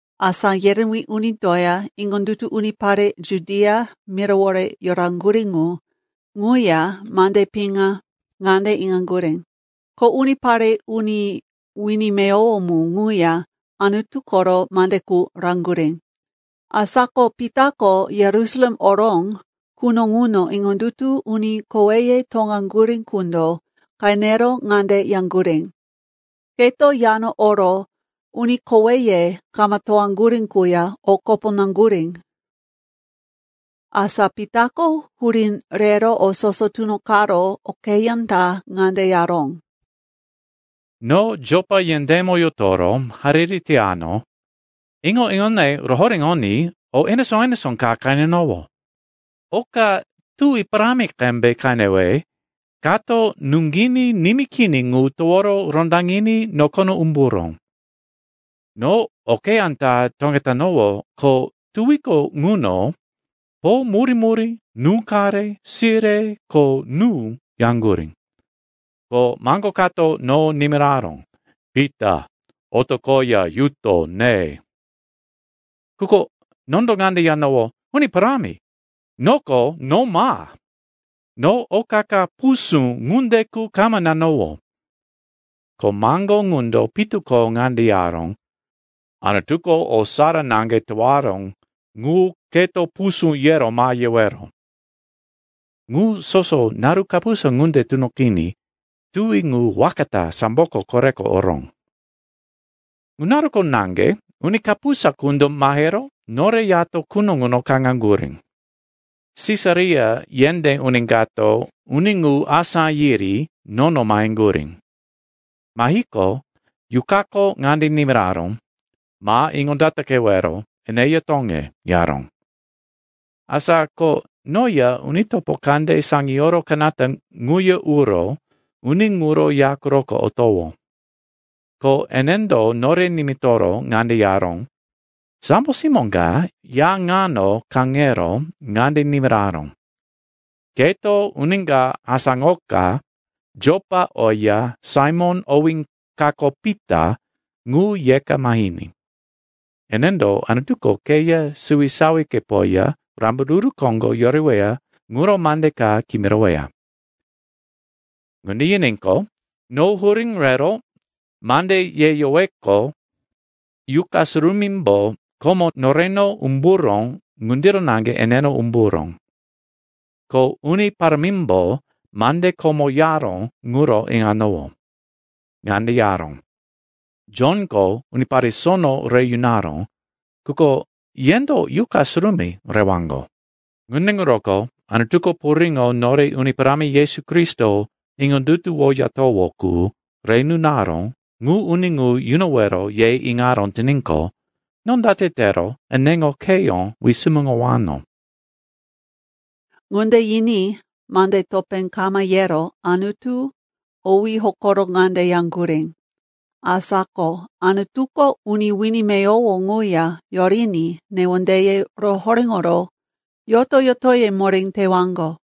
Asá yerewí unindoya iŋondutu unipare Judia mirawore yoraŋgurí ŋu ŋuya mande piŋa ŋande iŋaŋgurí, ko unipare uni wini meyowo mu ŋuya Anutu koro mande qu raŋgurí. Asa ko Pitako Yerusalem oró quno ŋuno iŋondutu uni koweye toŋaŋgurí qundo qenero ŋande yaŋgurí, “Keto yano oro uni koweye kama toŋaŋgurí quya o kopo naŋgurí!” Asa Pitako hurí rero o soso tunoqaró okeyá ta ŋande yaró, “No Jopa yendémo yotoro hariri teyano, iŋo-iŋone rohoréŋoní o enesó-enesó ka qenenowó. Oka tuwi parámi qembe qenewe kato nuŋginí nimí kini ŋu toworo rondaŋiní nokono umburó. No okeyá ta toŋetanowó, ko tuwiko ŋuno po murí-murí, nú-qare, sire ko nú yaŋgurí. Ko maŋgo kato no nimiraró, ‘Pita, otoqoya yuto ne.’ “Quko nondo ŋande yanowó, ‘Uni Parámi, noko no ma! No oka ka pusú ŋunde qu kama nanowó.’ “Ko maŋgo ŋundo pitu ko ŋande yaró, ‘Anutuko o sara naŋge towaró ŋu keto pusú yero ma yewero.’ Ŋu soso naru kapusa ŋunde tunoqiní tuwi ŋu waka ta samboko koreko oró. “Ŋu naruko naŋge uni kapusa qundo mahero nore yato quno ŋuno kaŋaŋgurí. Sisaria yendé uni kato uni ŋu asá yiri nono maheŋgurí. Mahiqo, Yuqako ŋande nimiraró, ‘Ma iŋondataqewero, eneya toŋe,’ yaró. Asa ko noya uni topo kande saŋiyoro kanata ŋuya uro uni ŋuro ya quroko otowó. Ko enendo nore nimitoro ŋande yaró, ‘Sambo simó ka ya ŋano kaŋero ŋande nimiraró, “Keto uni ka asáŋoka Jopa oya Saimon owí kako Pita ŋu yeka mahiní. Enendo Anutuko keya suwisawikepoya rambaruru koŋgo yoreweya ŋuro mande ka kimiroweya.”’ “Ŋunde yiníqo, no hurí rero mande yeyoweqo Yuqa Surumímbo komo noreno umburó ŋundiro naŋge eneno umburó. Ko Uni Parámimbo mande komo yaró ŋuro iŋanowó. Ŋande yaró, ‘Jonko unipare sono re yunaró, quko yendo Yuqa Surumí rewaŋgo.’ Ŋunde ŋuroko Anutuko puriŋo nore Uni Parámi Yesu Kristo iŋondutuwoyatowó qu re nunaró ŋu uni ŋu yunowero ye iŋaró tiníqo, no date tero eneŋo kheyó wisumuŋowano?” Ŋunde yiní mande topé kama yero Anutu owí hokoro ŋande yaŋgurí, “Asa ko Anutuko uni wini meyowo ŋuya yoriní newondeye rohoréŋoro yoto-yotoye moré tewaŋgo.”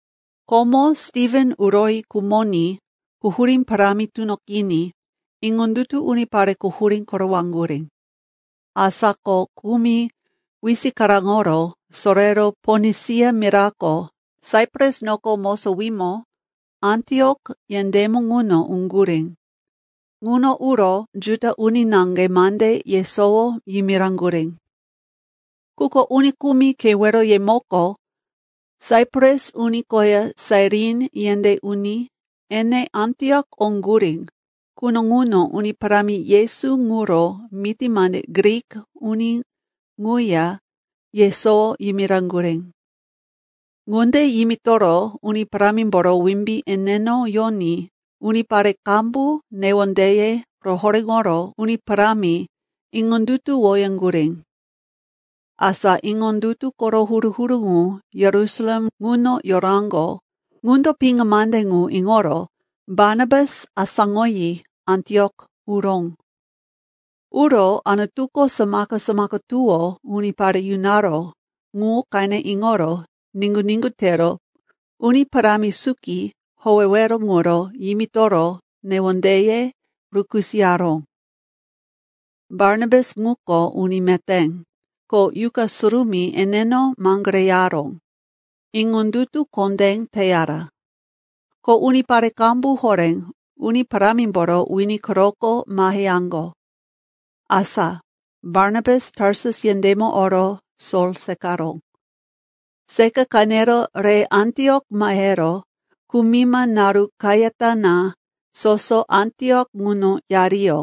Komo Stiven uroyi khumoní quhurí parámi tunoqiní iŋondutu unipare quhurí korowaŋgurí. Asa ko kumi wisikaraŋoro sorero Ponisia mirako, Saipras noko mosowímo, Antiok yendémo ŋuno uŋgurí. Ŋuno uro Juda uni naŋge mande yesowo yimiraŋgurí. Quko uni kumi keweroyemoko, Saipras uni koya Sairin yendé uni, ene Antiok oŋgurí quno ŋuno Uni Parámi Yesu ŋuro miti mande Grik uni ŋuya yesowo yimiraŋgurí. Ŋunde yimitoro Uni Parámimboro wimbí eneno yoní unipare qambu newondeye rohoréŋoro Uni Parámi iŋondutuwoyaŋgurí. Asa iŋondutu koro huru-huru ŋu Yerusalem ŋuno yoraŋgo ŋundo piŋa mande ŋu iŋoro Barnabas asáŋoyi Antiok uró. Uro Anutuko samaka-samaka tuwó unipare yunaró ŋu qene iŋoro niŋgu-niŋgu tero Uni Parámi suki howewero ŋuro yimitoro newondeye rukisoyaró. Barnabas ŋuko uni meté, ko Yuqa Surumí eneno maŋgoreyaró, iŋondutu kondé teyara. Ko unipare qambu horé Uni Parámimboro wini quroko maheyaŋgo. Asa Barnabas Tarsus yendémo oro Sol seqaró. Seqa qenero re Antiok mahero kumima naru kayata na soso Antiok ŋuno yariyó.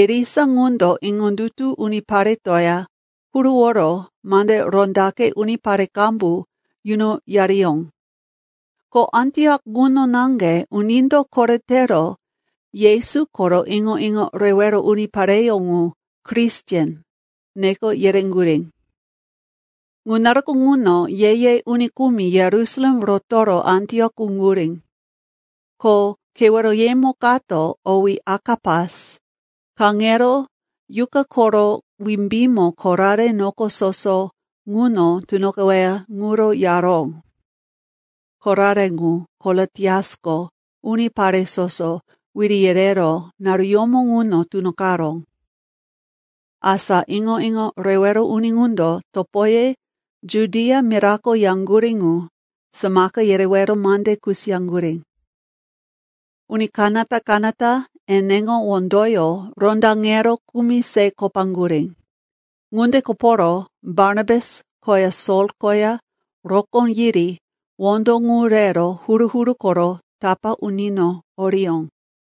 Irisa ŋundo iŋondutu uniparetoya huruworo mande rondaqe unipare qambu yunoyariyó. Ko Antiok ŋuno naŋge unindo koretero Yesu koro iŋo-iŋo rewero unipareyó ŋu “Kristen” neko yereŋgurí. Ŋu naruko ŋuno ye-ye uni kumi Yerusalem rotoro Antiok uŋgurí. Ko keweroyemo kato, owí Akapas, kaŋero Yuqa koro wimbímo korare noko soso ŋuno tunoqeweya ŋuro yaró. (Korare ŋu, Kolotiasko unipare soso wiri yereró naruyómo ŋuno tunoqaró.) Asa iŋo-iŋo rewero uni ŋundo topoye Judia mirako yaŋgurí ŋu samaka yerewero mande kusiyaŋgurí. Uni kanata-kanata eneŋo wondoyó rondaŋero kumi se kopaŋgurí. Ŋunde koporo Barnabas koya Sol koya rokó yiri wondo ŋu rero huru-huru koro tapá unino oriyó.